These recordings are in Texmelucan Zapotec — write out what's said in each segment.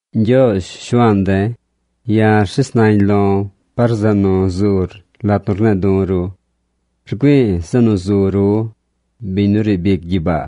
Ñgyoozh, Shuaan de̱, ya̱ rshes nañ lo̱ par zeꞌ nu zur lat nu rne̱e̱ du̱ ru. Rgüi̱i̱ zeꞌ nu zu ru, biñ nu riib ic gyibaa.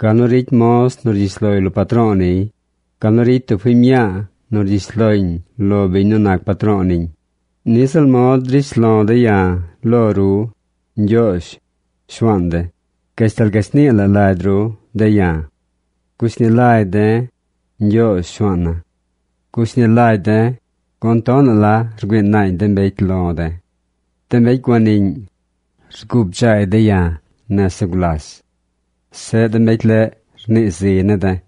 Gal nu ricy moz nu rgyish loy lo patro̱o̱ niy, gal nu ricy tub fiñ mñaa nu rgyish loñ lo biñ nu nac patro̱o̱ niñ, niꞌ ziꞌl mod drish lo̱ de̱ ya̱ lo ru, Ñgyoozh, Shuaan de̱, gashtal gashnii la lagy ru de̱ ya̱. Gushni lagy de̱, Ñgyoozh, Shuaana̱. Gushni lagy de̱, gun tonaꞌ la rgüii naañ de mbecy lo̱ de̱. De mbecy guaniꞌñ, rguu bdzaay de̱ ya̱ nese gulas. Zeꞌ de mbecy leꞌ rnii ziy ne̱ de̱.